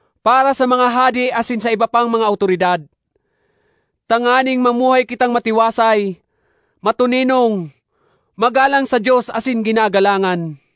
para sa mga hade asin sa iba pang mga awtoridad, tanganing mamuhay kitang matiwasay, matoninong, magalang sa Dios asin ginagalangan.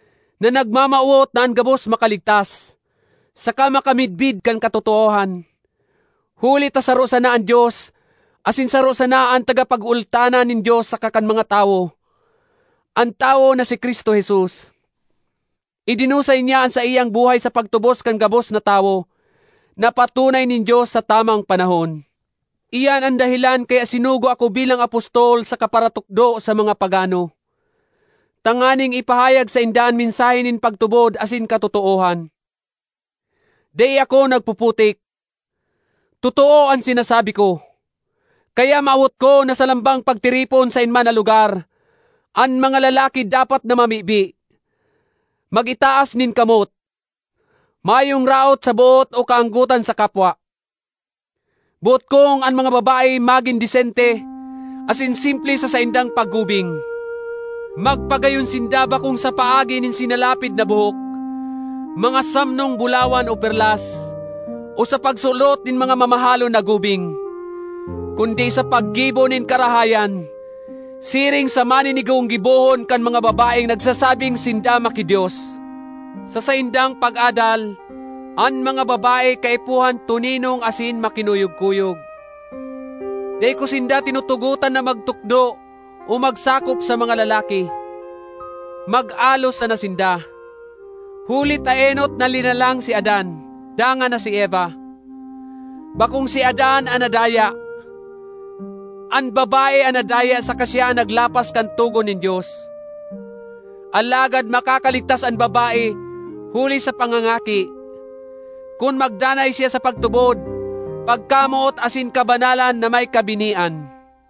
na nagmamawot na an gabos makaligtas, saka makamidbid kan katotoohan. Huli ta saro sana an Dios asin saro sana an tagapagultanan nin Dios saka kan mga tawo—an tawo na si Cristo Jesus. Idinusay niya an saiyang buhay sa pagtubos kan gabos na tawo, na patunay nin Dios sa tamang panahon. Iyan an dahelan kaya sinugo ako bilang apostol saka paratukdo sa mga pagano, tanganing ipahayag sainda an mensahe nin pagtubod asin katotoohan. Dai ako nagpuputik. Totoo an sinasabi ko! Kaya mawot ko na sa lambang pagtiripon saen man na lugar, an mga lalaki dapat na mamibi, mag-itaas nin kamot, mayong raot sa boot o kaanggotan sa kapwa. Boot kong an mga babae magin desente asin simple sa saindang paggubing. Magpagayon sinda bakong sa paagi nin sinalapid na buhok, mga samnong bulawan o perlas, o sa pagsulot nin mga mamahalon na gubing, kundi sa paggibo nin karahayan, siring sa maninigong gibohon kan mga babaeng nagsasabing sinda maki-Dios. Sa saindang pag-adal, an mga babae kaipuhan toninong asin makinuyog-kuyog. Dai ko sinda tinutugotan na magtukdo o magsakop sa mga lalaki; mag-alo sana sinda. Huli ta enot na linalang si Adan, dangan na si Eva. Bakong si Adan an nadaya; an babae an nadaya saka siya an naglapas kan togon nin Dios. Alagad makakaligtas an babae huli sa pangangaki, kun magdanay siya sa pagtubod, pagkamoot asin kabanalan na may kabinian.